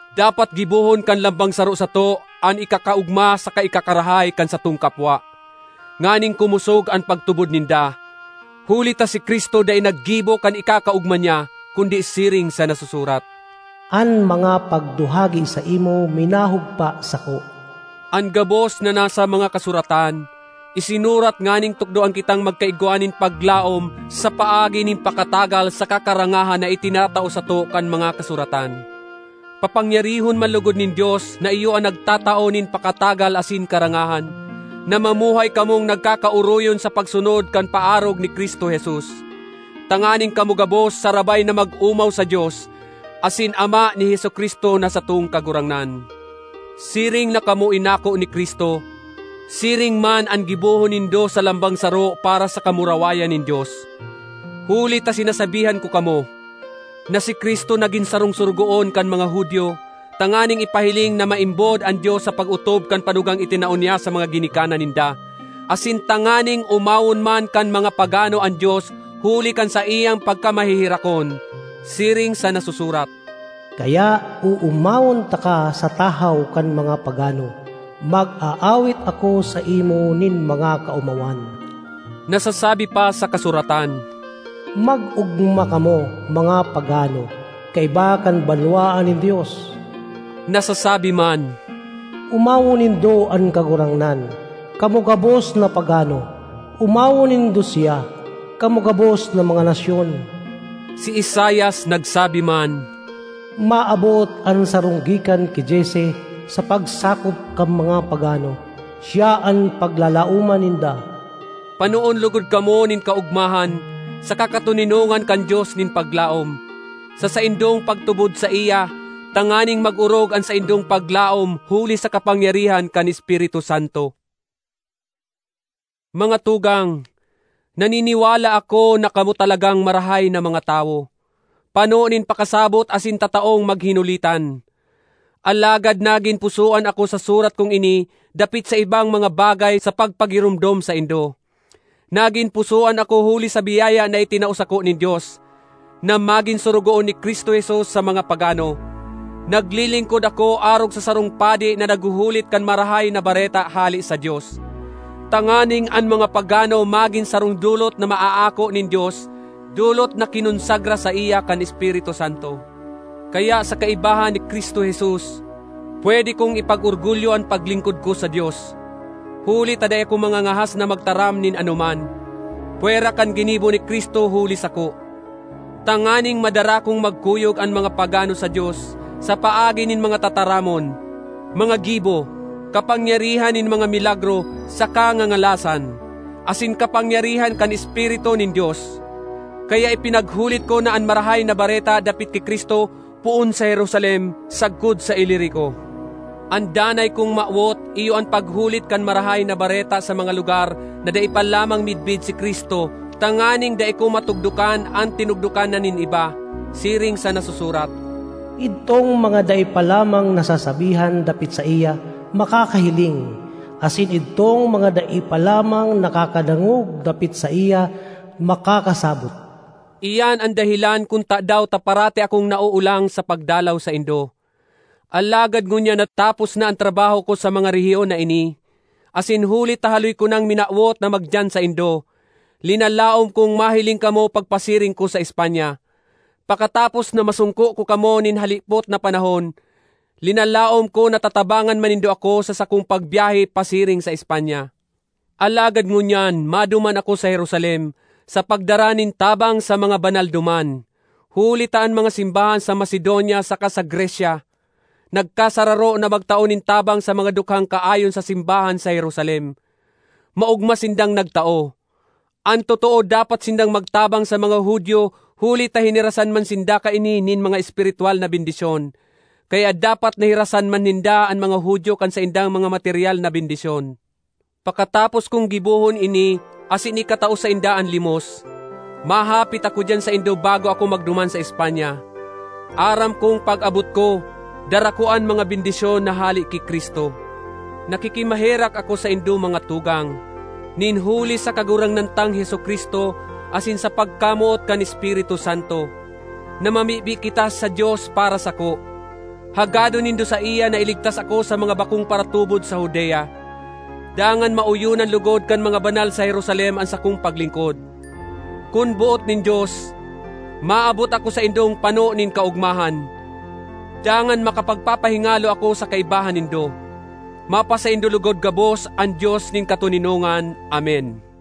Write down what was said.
Dapat gibohon kan lambang saro sato an ikakaogma saka ikakarahay kan satong kapwa, nganing kumosog an pagtubod ninda. Huli ta si Cristo dai naggibo kan ikakaogma niya, kundi siring sa nasusurat, “An mga pagduhagi saimo minahugpa sako.” An gabos na nasa mga Kasuratan, isinurat nganing tukdoan kitang magkaigwa nin paglaom sa paagi nin pakatagal saka karangahan na itinatao sato kan mga Kasuratan. Papangyarihon man logod nin Dios, na iyo an nagtatao nin pakatagal asin karangahan, na mamuhay kamong nagkakaoroyon sa pagsunod kan paarog ni Cristo Jesus, tanganing kamo gabos sarabay na mag-omaw sa Dios asin Ama ni Jesu-Cristo na satong Kagurangnan. Siring na kamo inako ni Cristo, siring man an gibohon nindo sa lambang saro para sa kamurawayan nin Dios. Huli ta sinasabihan ko kamo, na si Cristo nagin sarong sorogoon kan mga Judio tanganing ipahiling na maimbod an Dios sa pag-otob kan panugang itinao niya sa mga ginikanan ninda, asin tanganing omawon man kan mga pagano an Dios huli kan saiyang pagkamaheherakon. Siring sa nasusurat, “Kaya oomawon taka sa tahaw kan mga pagano; mag-aawit ako saimo nin mga kaomawan.” Nasasabi pa sa kasuratan, “Mag-ogma kamo, mga pagano, kaiba kan banwaan nin Dios!” Nasasabi man, “Omawon nindo an Kagurangnan, kamo gabos na pagano; omawon nindo siya, kamo gabos na mga nasyon!” Si Isaias nagsabi man, “Maabot an sarong gikan ki Jesse sa pagsakop kan mga pagano; siya an paglalaoman ninda.” Panoon logod kamo nin kaogmahan saka katoninongan kan Dios nin paglaom, sa saindong pagtubod saiya, tanganing mag-orog an saindong paglaom huli sa kapangyarihan kan Espiritu Santo. Mga tugang, naniniwala ako na kamo talagang marahay na mga tawo, pano nin pakasabot asin tataong maghinulitan. Alagad nagin pusoan ako sa surat kong ini dapit sa ibang mga bagay sa pagpagiromdom saindo. Nagin pusoan ako huli sa biyaya na itinao sako nin Dios, na magin sorogoon ni Cristo Jesus sa mga pagano. Naglilingkod ako arog sa sarong padi na naghuhulit kan Marahay na Bareta hale sa Dios, tanganing an mga pagano magin sarong dolot na maaako nin Dios, dolot na kinonsagra saiya kan Espiritu Santo. Kaya sa kaibahan ni Cristo Jesus pwede kong ipag-orgulyo an paglingkod ko sa Dios. Huli ta dai ako mangangahas na magtaram nin anoman, pwera kan ginibo ni Cristo huli sako, tanganing madara kong magkuyog an mga pagano sa Dios sa paagi nin mga tataramon, mga gibo, kapangyarihan nin mga milagro saka ngangalasan, asin kapangyarihan kan Espiritu nin Dios. Kaya ipinaghulit ko na an Marahay na Bareta dapit ki Cristo poon sa Jerusalem sagkod sa Ilirico. An danay kong mawot iyo an paghulit kan Marahay na Bareta sa mga lugar na dai pa lamang midbid si Cristo tanganing dai ko matugdokan an tinugdokan na nin iba. Siring sa nasusurat, “Idtong mga dai pa lamang nasasabihan dapit saiya, makakahiling; asin idtong mga dai pa lamang nakakadangog dapit saiya, makakasabot.” Iyan an dahelan kun tadaw ta parati akong naoolang sa pagdalaw saindo. Alagad ngunyan na tapos na an trabaho ko sa mga rehiyon na ini, asin huli ta haloy ko nang minawot na magdiyan saindo, linalaom kong mahiling kamo pagpasiring ko sa Espanya. Pakatapos na masongko ko kamo nin halipot na panahon, linalaom ko na tatabangan man nindo ako sa sakong pagbyahe pasiring sa Espanya. Alagad ngunyan maduman ako sa Jerusalem sa pagdara nin tabang sa mga banal duman, huli ta an mga simbahan sa Macedonia saka sa Grecia nagkasararo na magtao nin tabang sa mga dukhang kaayon sa simbahan sa Jerusalem. Maogma sindang nagtao. An totoo dapat sindang magtabang sa mga Judio huli ta hinirasan man sinda kaini nin mga espiritwal na bendisyon. Kaya dapat na hirasan man ninda an mga Judio kan saindang mga materyal na bendisyon. Pakatapos kong gibohon ini asin ikatao sainda an limos, mahapit ako diyan saindo bago ako magduman sa Espanya. Aram kong pag-abot ko, dara ko an mga bendisyon na hale ki Cristo. Nakikimaherak ako saindo, mga tugang, nin huli sa Kagurangnan tang Jesu-Cristo asin sa pagkamoot kan Espiritu Santo, na mamibi kita sa Dios para sako. Hagadon nindo saiya na iligtas ako sa mga bakong paratubod sa Judea, dangan maoyonan logod kan mga banal sa Jerusalem an sakong paglingkod. Kun boot nin Dios, maabot ako saindong pano nin kaogmahan, dangan makapagpapahingalo ako sa kaibahan nindo. Mapasaindo logod gabos an Dios nin katoninongan. Amen.